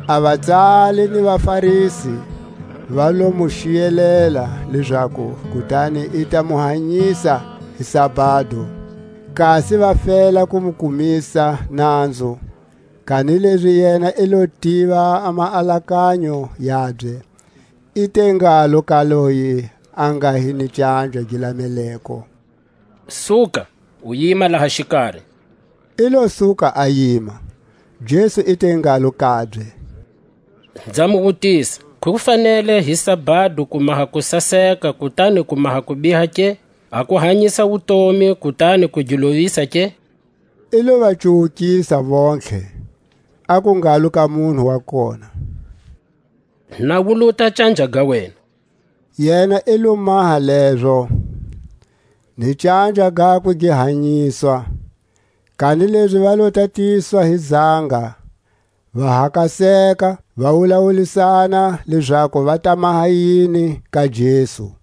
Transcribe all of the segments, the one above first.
A vatsali ni vaFarisi va lo mu xiyelela, lezaku kutani i ta mu hanyisa hi sabado; kasi va fela ku mu kumisa nanzu. Kanilezi yena i lo tiva a maalakanyo yabye; i te ngalo ka loye a nga hi ni canja gi lameleko: Suka, u yima laha xikari; i lo suka a yima. Jesu i te ngalo kabye: Nza mu wutisa, Ku fanele hi sabado ku maha kusaseka, kutani ku maha kubiha ke, a ku hanyisa wutomi, kutani ku gi lovisa ke? I lo va cuwukisa vontlhe, aku ngalo ka munhu wa kona: Nawuluta a canja ga wena. Yena i lo maha lezo, ni canja gakwe gi hanyiswa. Kanilezi va lo tatiswa hi zanga, va hakaseka; va wulawulisana lezaku va ta maha yini ka Jesu.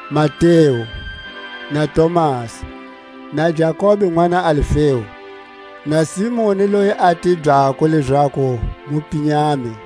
Mateu na Tomasi, na Jakobe nʼwana Alfeu, na Simoni loyi a tibyako lezaku Mupinyami,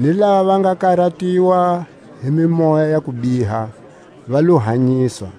ni lava va nga karatiwa hi mimoya ya kubiha va lo hanyiswa.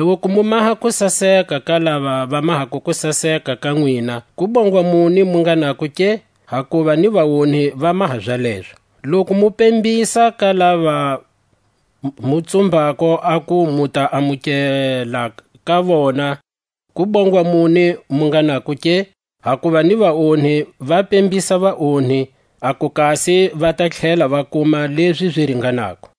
Loku mu maha kusaseka ka lava va mahako kusaseka ka nwina, kubongwa muni mu nga nako ke? Hakuva ni vaonhi va maha zalezo. Loku mu pembisa ka lava mu tsumbako aku mu ta amukela ka vona, kubongwa muni mu nga nako ke? Hakuva ni vaonhi va pembisa vaonhi, aku kasi va ta tlhela va kuma lezi zi ringanako.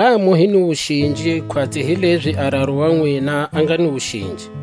Ngha mu hi ni wuxinji, khwatsi hilezi a Raru wa nwina a nga ni wuxinji.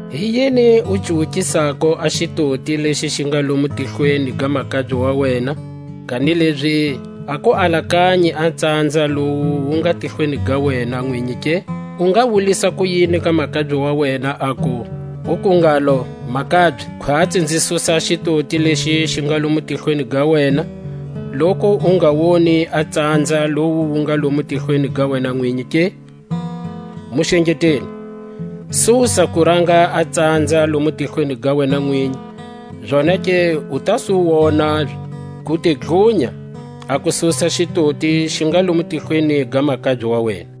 Hi yini u cuwukisako a xitoti lexi xi nga lomu tihlweni ga makabye wa wena, kanilezi a ku alakanyi a tsanza lowu wu nga tihlweni ga wena nwinyi ke? U nga wulisa kuyini ka makabye wa wena, uku ngalo: Makabye, khwatsi, nzi susa a xitoti lexi xi nga lomo tihlweni ga wena, loku u nga woni a tsanza lowu wu nga lomo tihlweni ga wena nwinyi ke? Muxengeteli! susa kuranga a tsanza lomu tihlweni ga wena nwinyi, zonake u ta su wona ku te dlunya a ku susa xitoti xi nga lomu tihlweni ga makabye wa wena.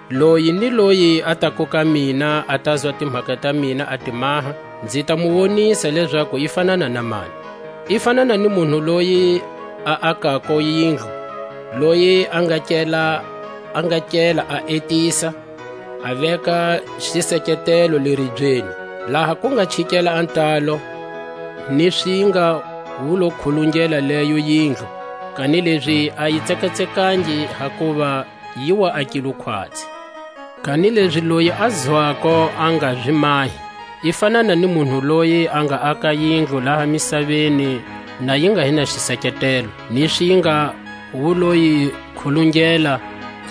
Loyi ni loyi a tako ka mina, a tazwa timhaka ta mina a ti maha, nzi ta mu wonisa lezaku i fanana na mani. I fanana ni munhu loyi a akako yindlu, loyi a nga kela a etisa, a veka xiseketelo le ribyeni. Laha ku nga chikela a ntalo, ni swinga wu lo khulungela leyo yindlu, kanilezi a yi tsekatsekangi; hakuva yi wa akilwe khwatsi. Kanilezi loyi a zwako, a nga zi mahi, i fanana ni munhu loyi a nga aka yindlu laha misaveni na yi nga hi na xiseketelo; ni swinga wu lo yi khulungela,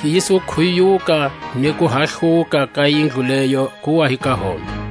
yi su khuyuka; ni kuhahluka ka yindlu leyo ku wa hi ka hombe.